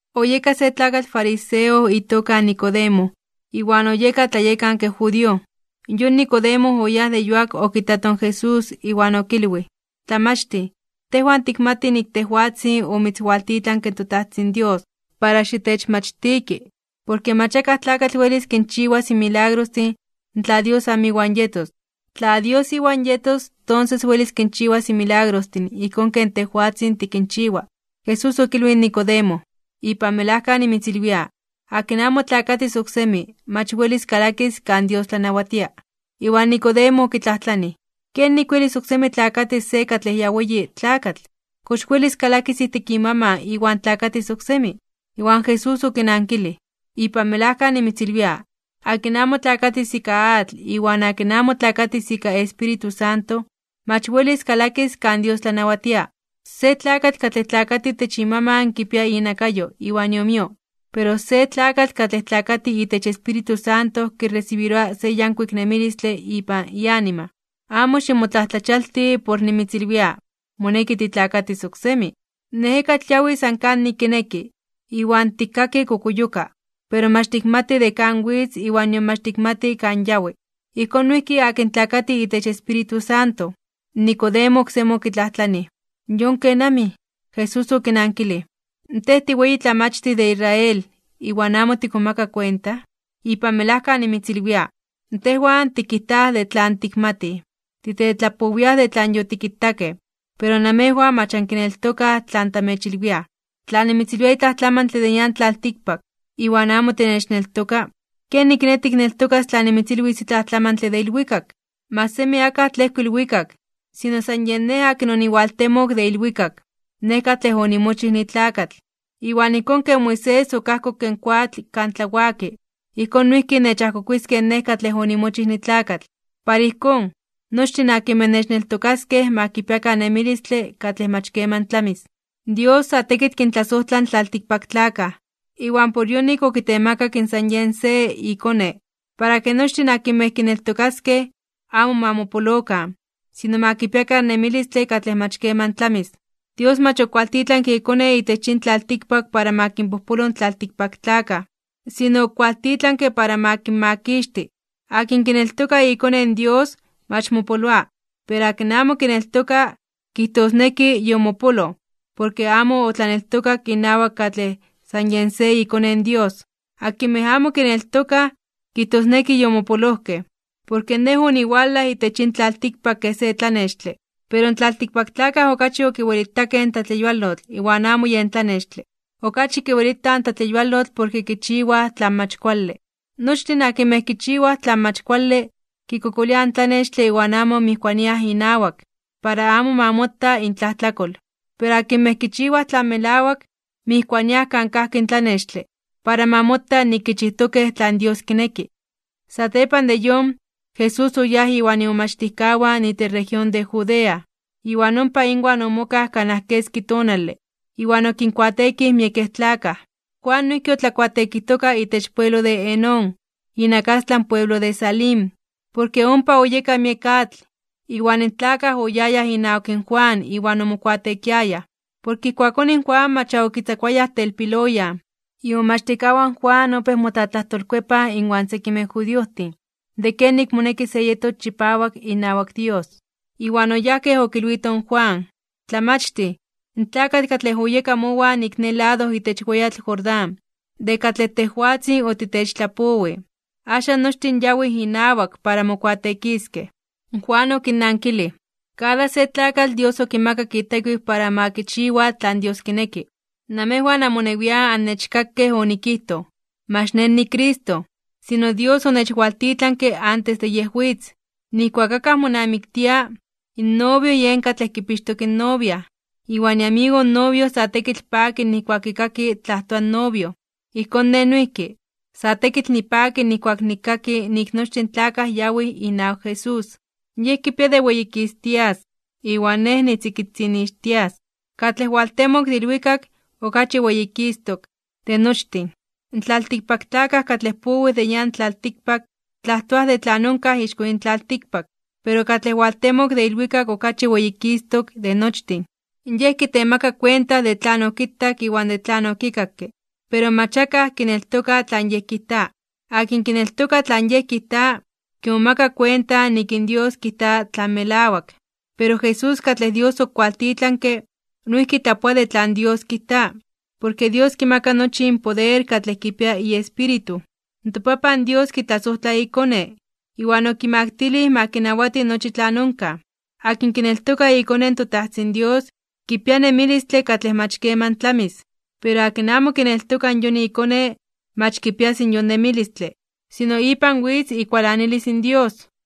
Oyeka se tlakatl fariseo itoka Nicodemo, iwan oyeka tlayekanke judío. Yon Nicodemo oyáj de yuak okitato in Jesús iwan okilwij: ―Tlamachtij, tejwan tikmatij nik tejwatzin omitzwaltitlanke in toTajtzin Dios para xitechmachtiki. Porke mach akaj tlakatl welis kinchiwas in milagrostin tla Dios amo iwan yetos. Tla Dios iwan yetos, tonses welis kinchiwas in milagrostin ijkón ken tejwatzin tikinchiwa. Jesús okilwij in Nicodemo: ―Ipan melajka nimitzilwia: Akin amo tlakatis oksemi, mach welis kalakis kan Dios tlanawatia. Iwan Nicodemo okitlajtlanij: ―¿Kenik welis oksemi tlakatis se katlej ya weyi tlakatl? ¿Kox welis kalakis ijtik imaman iwan tlakatis oksemi? Iwan Jesús okinankilij: ―Ipan melajka nimitzilwia: Akin amo tlakatis ika atl iwan akin amo tlakatis ika Espíritu Santo, mach welis kalakis kan Dios tlanawatia. Se tlakatl katlej tlakati itech imaman kipia inakayo iwan iomio, pero se tlakatl katlej tlakati itech Espíritu Santo kiresibiroa se yankuik nemilistle ipan ianima. Amo ximotlajtlachialti (ximomajmawti) por nimitzilwia: “Moneki titlakatis oksemi.” In ejekatl yawi san kanik kineki, iwan tikkaki kokuyoka. Pero mach tikmati de kan witz iwan nion mach tikmati kan yawi. Ijkón noijki akin tlakati itech Espíritu Santo. Nicodemo oksemi okitlajtlanij: ―¿Yon kenamij? Jesús okinankilij: ―¿Tej tiweyitlamachtij de Israel, iwan amo tikmomaka kuenta? Ipan melajka nimitzilwia, tejwan tikijtaj de tlan tikmatij. Titetlapowiaj de tlan yotikitakej, pero namejwan mach ankineltokaj tlan tamechilwiaj. Tla nimitzilwia itlaj tlamantle de nian tlaltikpak, iwan amo tinechneltoka, ¿kenik kiné tikneltokas tla nimitzilwis itlaj tlamantle de ilwikak? ’Mach semi akaj tlejko ilwikak, sino san Nej akin oniwaltemok de ilwikak, Nej katlej onimochij nitlakatl. Iwan ijkón ken Moisés okajkokke in koatl kan tlawaki, ijkón noijki nechajkokuiskej Nej katlej onimochij nitlakatl. Para ijkón, nochtin akinmej nechneltokaskej ma kipiakan nemilistle katlej mach keman tlamis. ’Dios sa tekitl kintlasojtla in tlaltikpaktlakaj, iwan por yonik okitemakak in san Yej se iKone, para ke nochtin akinmej kineltokaskej, amo ma mopolokan, sino ma kipiakan nemilistle katlej mach keman tlamis. Dios mach okualtitlanke iKone itech yin tlaltikpak para ma kinpojpolo in tlaltikpaktlakaj, sino okualtitlanke para ma kinmakixti. Akin kineltoka iKone in Dios, mach mopoloa. Pero akin amo kineltoka, kijtosneki yomopoloj porke amo otlaneltokak inawak katlej san Yej se iKone in Dios. Akinmej amo kineltokaj, kijtosneki yomopolojkej. Porke Nej oniwalaj itech yin tlaltikpak kej se tlanextle. Pero in tlaltikpaktlakaj okachi okiwelitakej in tlatleyualotl (tlatleyuwalistle) iwan amo yen tlanextle. Okachi kiwelitaj in tlatleyualotl porke kichiwaj tlan mach kuale. Nochtin akinmej kichiwaj tlan mach kuale, kikokoliaj in tlanextle iwan amo mijkuaniaj inawak, para amo ma mota intlajtlakol. Pero akinmej kichiwaj tlan melawak, mijkuaniaj kan kajki in tlanextle, para ma mota nik kichijtokej tlan Dios kineki. Satepan de yon, Jesús oyáj iwan imomachtijkawan itech región de Judea, iwan ompa inwan omokaj kanaj keski tonale, iwan okinkuateekij miekej tlakaj. Juan noijki otlakuateekijtoka itech pueblo de Enón, inakastlan pueblo de Salim, porke ompa oyeka miek atl. Iwan in tlakaj oyayaj inawak in Juan iwan omokuateekiayaj. Porke ijkuakón in Juan mach ya okitzakuayaj telpiloyan. Imomachtijkawan in Juan opéj motlatlajtolkuepaj inwan sekimej judiojtin de kenik moneki se yetos chipawak inawak Dios. Iwan oyajkej okilwitoj in Juan: ―Tlamachtij, in tlakatl katlej oyeka mowan ik ne lado itech weyatl Jordán, de katlej tejwatzin otitechtlapowij, axan nochtin yawij inawak para mokuateekiskej. Juan okinnankilij: ―Kada se tlakatl Dios okimakak itekiw para ma kichiwa tlan Dios kineki. Namejwan amonewian annechkakej onikijtoj nik mach nej niCristo, sino Dios onechwaltitlanke antes de Yej witz. Nijkuak akaj monamiktia, in novio yen katlej kipixtok in novia, iwan iamigo in novio sa tekitl paki nijkuak kikaki tlajtoa in novio. Ijkón nej noijki, sa tekitl nipaki nijkuak nikkaki nik nochtin tlakaj yawij inawak Jesús. Yej kipia de weyikistias (weyititias) iwan nej nitzikitzinixtias. ’Katlej owaltemok de ilwikak, okachi weyikistok (weyititok) de nochtin. In tlaltikpaktlakaj katlej powij de nian tlaltikpak, tlajtoaj de tlan onkaj ixko yin tlaltikpak. Pero katlej owaltemok de ilwikak okachi weyikistok de nochtin. Yej kitemaka kuenta de tlan okitak iwan de tlan okikakke, pero mach akaj kineltoka tlan Yej kijta. Akin kineltoka tlan Yej kijta, kimomaka kuenta nik in Dios kijta tlan melawak. Pero Jesús katlej Dios okiwaltitlanke, noijki tlapoa de tlan Dios kijta, porke Dios kimaka nochi in poder katlej kipia iEspíritu. ToPapan Dios kitlasojtla iKone, iwan okimaktilij ma kinawati nochi tlan onkaj. Akin kineltoka iKone in toTajtzin Dios, kipia nemilistle katlej mach keman tlamis. Pero akin amo kineltoka yon iKone, mach kipias yon nemilistle, sino ipan witz ikualanilis in Dios.